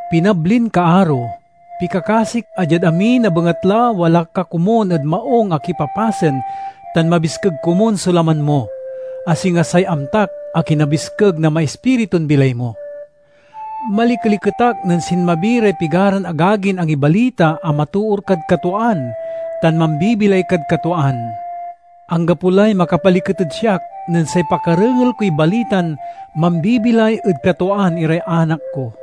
Pinablin kaaro, pikakasik a diad amin a bengatla wala ka komun ed maung a kipapasen tan mabiskeg komun so laman mo—a singa say amtak a kinabiskeg na maispiritun bilay mo. Malikeliket ak nen sinmabi ray pigaran agagin angibalita a matoor kad katwaan tan mambibilay kad katwaan. Anggapo lay makapaliket ed siak nen say pakarengel koy balitan mambibilay ed katwaan iray anak ko.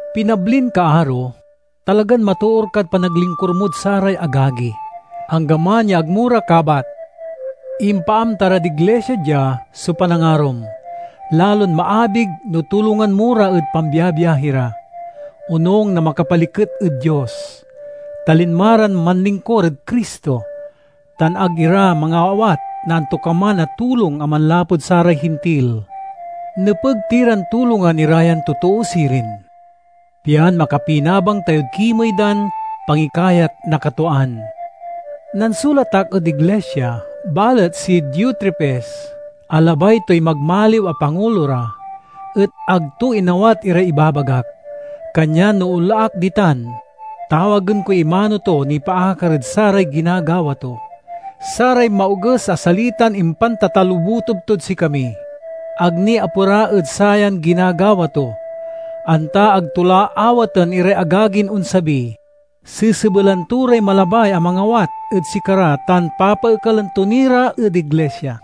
Pinablin kaaro, talagan matoor kad panaglingkur mod saray agagi, anggaman ya ag mo ra kabat. Impaamta rad iglisia dia so panangarom. Lalon maabig no tulongan mo ra ed pambiabiahi ra, onung na makapaliket ed Dios. Ta linma ran manlingkur ed Cristo, tan ag ira mangaawat na antokaman a tulong a manlapud saray Hintil. Nepeg ti ran tulongan ira yan totoo sirin, pian makapinabang tayod kimey dan pangikayat na katwaan. Nansulat ak ed iglisia; balet si Diotrefes, a labay toy magmaliw a pangulo ra, et ag to inawat iray ibabagak. Kanyan no onla ak ditan, tawagen koy imano to nipaakar ed saray ginagawa to: saray maoges a salitan impantatalobutob tod sikami. Ag ni apera ed sayan ginagawa to. Anta ag to la awaten iray agagin onsabi, sesebelan to ray malabay a mangawat ed sikara tan papaekalen to ni ra ed iglisia!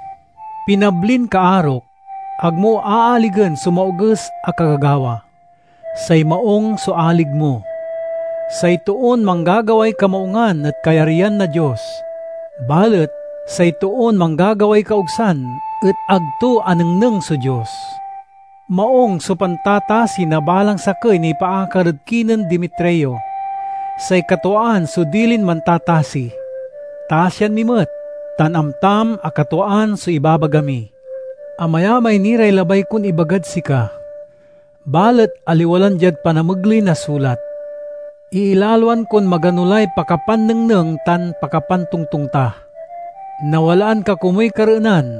Pinablin kaarok, ag mo aaligen so maoges a kagagawa; say maung so alig mo. Say toon manggagaway kamaungan et kayaryan na Dios, balet say toon manggagaway kaogsan et ag to anengneng so Dios. Maung so pantatasi na balang sakey nipaakar ed kinen Demetrio; say katwaan so dilin mantatasi. Tasian mi met, tan amtam a katwaan so ibabaga mi. Amayamay ni ray labay kon ibagad sika, balet aliwa lan diad panamegley na sulat. Iilaloan kon magano lay pakapannengneng tan pakapantongtong ta. Nawalaan ka komuy kareenan.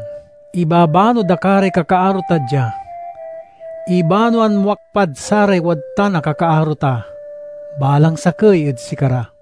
Ibabano da ka ray kakaaro ta dia. Ibanoan mo ak pad saray wadtan a kakaaro ta—balang sakey ed sikara.